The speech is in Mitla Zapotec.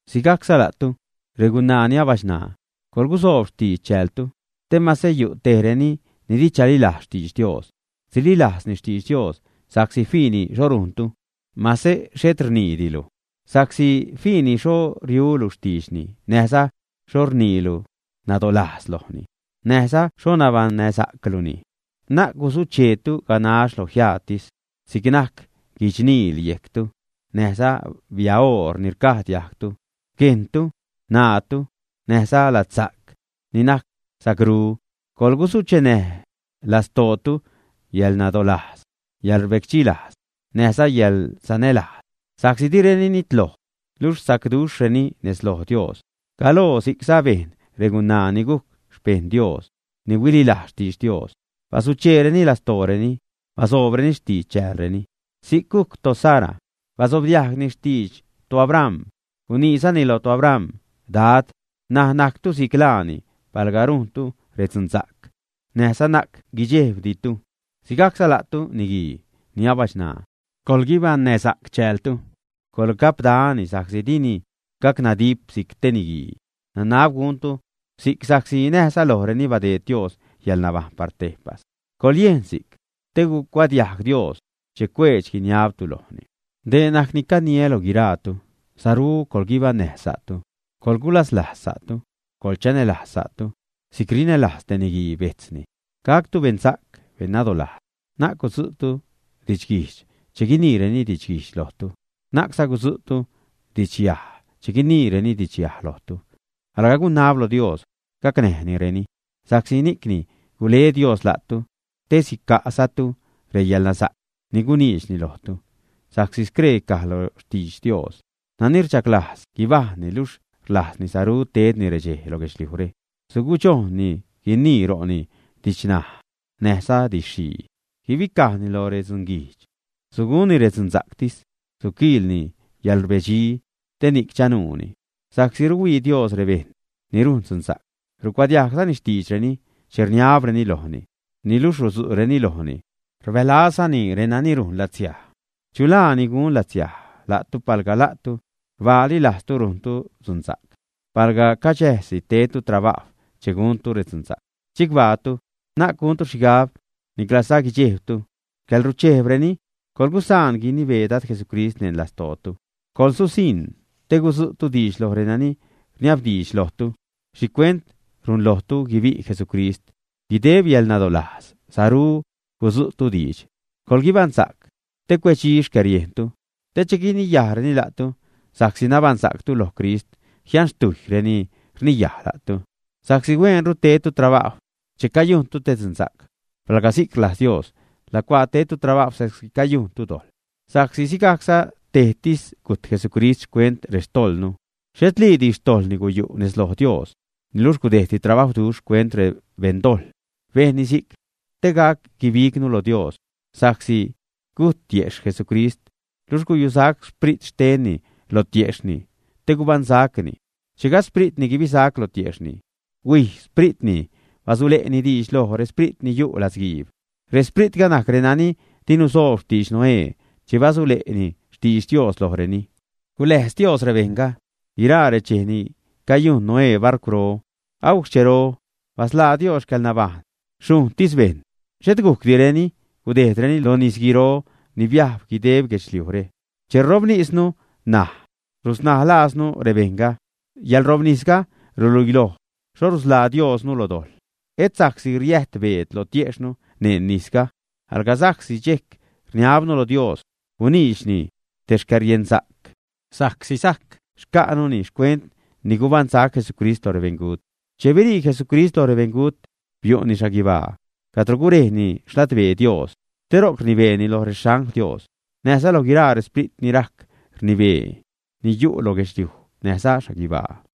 Sigajcza la'tu, regunaa ni abachṉaa, coḻgusoob xtidx chäältu, te mase yu' tejreni ni di chalilajz xtidx Dios, sililajzni xtidx Dios sa'csi fiini xho rujntu mase xhet rniidilu. Sa'csi fiini xho riulu xtiidxni näjza xho rniilu nadolajz lojni, näjza xho nabaṉnäsa'cluni. Na'c gusucheetu ganax lo jiaatis, si'c najc guichniil yejctu, näjza biaoor ni rcaj diajgtu, guejntu, ṉaatu, näjza ladsa'c ni najc sacru. Coḻgusuchenäj lastootu yäḻnadolajz, yäḻrbecdxi lajz, näjza yäḻsanälajz, sa'csi direni nitloj, luxh sacduxhreni nez loj Dios. Galoo si'cza bejn regunaa ni gujc xpejṉ Dios ni huililajz xtidx Dios, basucheereni lastooreni, basoobreni xtidx chäälreni. Si'c gujc toSara, basobdiajgni xtidx toAbram, guniizani lo toAbram, Dad. N̲aj najctu si'c laani palga rujntu redzunsa'c, näjza na'c guidxejbditu. Sigajcza la'tu, niguii ni abachṉaa, coḻguibaṉnäsa'c chäältu. Coḻgapdani sa'csi dini gacnadip si'c te niguii; nanab guntu si'c sa'csi näjza lojreni badeed Dios yäḻnabajṉ par tejpas. Coḻyejn si'c, te gucuadiajg Dios che cuedx-guiniabtu lojni. Dee najc ni caniä loj guiraatu, saru coḻguibaṉnäj sa'tu. Coḻgulaslajz sa'tu, coḻchanälajz sa'tu si'c rinälajz te niguii bejtzni. Gactu beṉsa'c, beṉnadolajz. Na'c gudzu'tu didxguijdx che guiniireni didxguijdx lojtu, na'cza gudzu'tu didxyaj che guiniireni didxyaj lojtu. Alga gunab lo Dios gacnäjnireni, sa'csi ni'cni gule Dios la'tu, te sica'zatu reyäḻnasa'c ni guniidxni lojtu. Sa'csi scree caj lo xtidx Dios: Nani rchaglajz guibajṉni, luxh rlajzzani saru tedni redxej lo guedxliujre, sugudxojnni guinii ro'ni didxnaj näjza didx-xhii. Guibicajni loj redzunguijdx, sugunni redzunsa'ctis. Suquiilni yäḻrbedxi te ni'c chanuuni. Sa'csi ruhuii Dios rebejṉ ni rujn dzunsa'c, rucuadiajgzani xtiidxreni che rniabreni lojni. Niluxh rudzuréni lojni, rbälazzani renani rujn latsiaj. ¿Chu laa ni gun latsiaj la'tu, palga la'tu rbaali lajztu rujntu dzunsa'c? Palga caxäjsi tedtu trabajw che guntu redzunsa'c. ¡Chicbaatu! Na'c guntu xhigab, niclaza guidxejbtu xcäḻruchejbreni. Coḻgusaan guinibee Dad Jesucrist neṉ lastootu, gususiṉ te gudzu'tu diidx loj reni rniabdiidx lojtu xhicuent runlojtu guibi' Jesucrist. Guideb yäḻnadolajz saru gudzu'tu diidx. Coḻguibaṉsa'c te cuedxi xcäḻriejntu te che guiniyajreni la'tu sa'csi nabaṉsa'ctu loj Crist, jianxtujy reni rniyaj la'tu. Sa'csi hueenru tedtu trabajw che cayuntu te dzunsa'c, palga si'c rlajz Dios, lacuaa tedtu trabajw sa'csi cayujntu dojḻ. Sa'csi sigajcza tejtis gujt Jesucrist xcuent rextojḻnu. Xhetliidi xtojḻni guyu' nez loj Dios, niluxh gudejdni trabajwduxh xcuent rebeṉdojḻ. Bejnni si'c te gac guibignu lo Dios sa'csi gujt tiejxh Jesucrist, luxh guyusac sprit xtenni lo tiejxhni te gubaṉsacni. Che gajd xpritni guibisac lo tiejxhni, huij spritni basule'ni diidx loj resprit ni yu' latzguiib. Respritga najc renani di nusoob xtidx Noé che basule'ni xtidx Dios lojreni. Guläjz Dios rebejṉga guiraa redxej ni cayujn Noé barcwro agujc xchero. Basḻaa Dios xcäḻnabajṉ xhujṉtis bejṉ, xhet gujcdireni gudejdreni lo nisguiro ni biajb guideb guedxliujre. Che ṟobnisnu ṉaj, rusnaalajznu rebejṉga; yäḻṟobnisga ruluiloj xho rusḻaa Diosnu lo dojḻ. Et sa'csi riäjt beed lo tiejxhnu neṉ nisga, alga sa'csi dxejc rniabnu lo Dios guniidxni te xcäriensa'c, sa'csi sajc xca'nuni xcuent ni gubaṉsac Jesucrist lo rebeṉgut. Che birii Jesucrist loj rebeṉgut, biu'ni xhaguibaa cadro gurejni xladbee Dios te ro'c rnibeeni loj rexangl Dios, näjza loj guiraa resprit ni rajc rnibee, ni yu' lo guedxliuj näjza xhaguibaa.